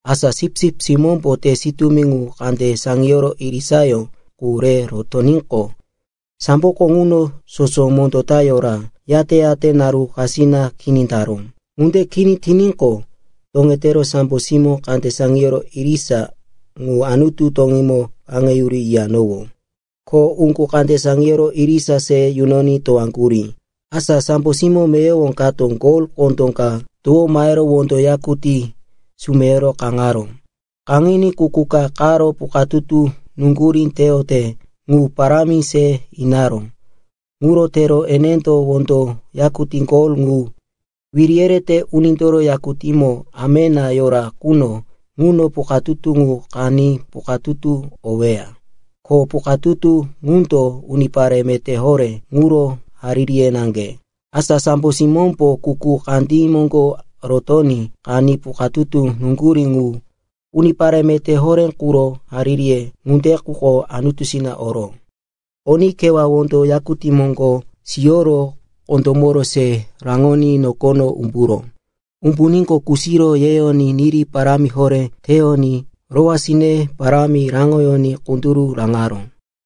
Asa Sipsip Simómbo te sitúmi ŋu kande saŋiyoro irisayó qu re rotoníqo, samboko ŋuno soso mondó ta yora yate-yate naru kasina kini taró. Ŋunde kini tiníqo, toŋetero sambo simó kande saŋiyoro irisa ŋu Anutu toŋímo kaŋeyuri yiyanowó. Ko uŋgu kande saŋiyoro irisa se yunoní towaŋgurí. Asa sambo simó meyowo kato gol kondó ka towo mahero wondo yakutí sumeyoro kaŋaró. Kaŋiní kuku ka qaro pukatutu nuŋgurí teyote ŋu parámi se inaró. Ŋuro tero enendo wondo yakutí gol ŋu wiri yerete unindoro yakutímo amena yora quno ŋuno kuku ŋu qaní pukatutu oweya. Ko pukatutu ŋundoko unipare meté horé quro haririye naŋge. Asa sambo simómbo kuku kandí moŋgo rotoní qaní pukatutu nuŋgurí ŋu, unipare meté horé quro haririye ŋunde quko Anutusina oró. Oní kewá wondo yakutí moŋgo siyoro kondómoro se raŋoní nokono umburó. Umbuníqo, kusiro yeyoní niri parámi horé teyoní rowá sine parámi raŋoyoní kunduru raŋaró.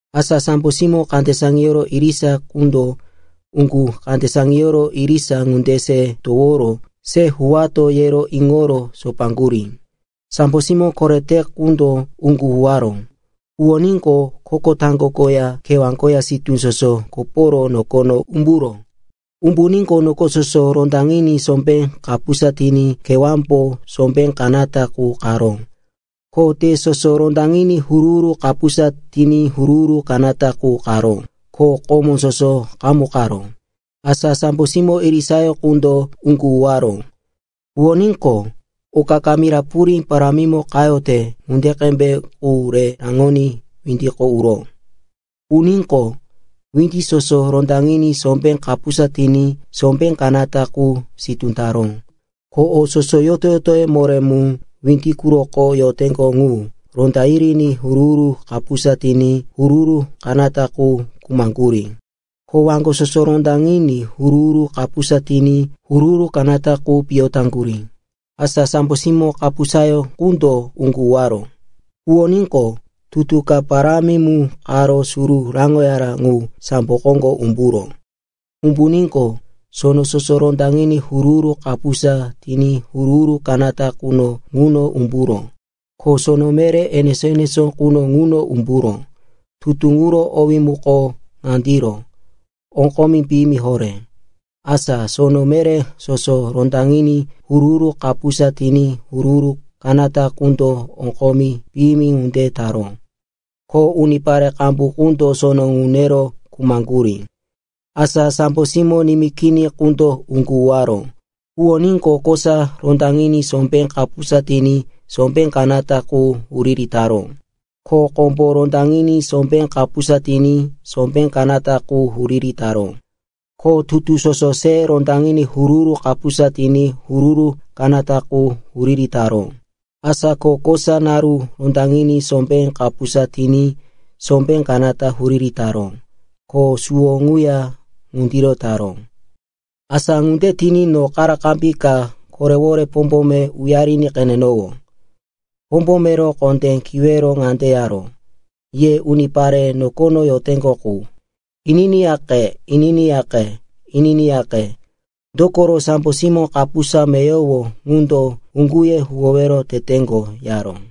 Asa sambo simó kande saŋiyoro irisa qundo uŋgu kande saŋiyoro irisa ŋunde se toworo, se huwato, yero iŋoro sopaŋgurí. Sambo simó korete qundo uŋgu huwaró. Huwoníqo, koko taŋgo koya kewá koya sitú soso koporo nokono umburó. Umbuníqo, noko soso rondaŋiní sombé kapusa tiní kewámbo sombé kanata qu qaró. Ko te soso rondaŋiní huru-huru kapusa tiní huru-huru kanata qu qaró. Ko komó soso qamukaró. Asa sambo simó irisayó qundo uŋgu huwaró. Huwoníqo, oka ka mira purí parámi qayote ŋunde qembe qu re raŋoní windiko uró. Uníqo, windi soso rondaŋiní sombé kapusa tiní sombé kanata qu sitú taró. Ko o soso yoto-yotoye moré mu windi quroko yoteŋgo ŋu ronda yiriní huru-huru kapusa tiní huru-huru kanata qu khumaŋgurí. Ko waŋgo soso rondaŋiní huru-huru kapusa tiní huru-huru kanata qu piyo taŋgurí. Asa sambo simó kapusayó qundo uŋgu huwaró. Huwoníqo, tutu ka parámi mu qaro suru raŋoyara ŋu sambo koŋgo umburó. Umbuníqo, sono soso rondaŋiní huru-huru kapusa tiní huru-huru kanata quno ŋuno umburó. Ko sono meré enesó-enesó quno ŋuno umburó. Tutu ŋuro owí muko ŋandiro, “Oŋgomi Piyimi Horé.” Asa sono meré soso rondaŋiní huru-huru kapusa tiní huru-huru kanata qundo oŋgomi piyimi ŋunde taró. Ko unipare qambu qundo sono ŋu nero khumaŋgurí. Asa sambo simó nimí kini qundo uŋgu huwaró. Huwoníqo, kosa rondaŋiní sombé kapusa tiní sombé kanata qu huriri taró. Ko kombo rondaŋiní sombé kapusa tiní sombé kanata qu huriri taró. Ko tutu soso se rondaŋiní huru-huru kapusa tiní huru-huru kanata qu huriri taró. Asa ko kosa naru rondaŋiní sombé kapusa tiní sombé kanata huriri taró. Ko suwo ŋuya ŋundiro taró. Asa ŋunde tiní no karakarambí ka korewore pombome uyariní qenenowó. Pombomero kondé kiwero ŋande yaró, “Ye unipare nokono yoteŋgo qu, ininiyaqe, ininiyaqe, ininiyaqe. Dokoro sambo simó kapusa meyowo ŋundo uŋguye huwowero teteŋgo,” yaró.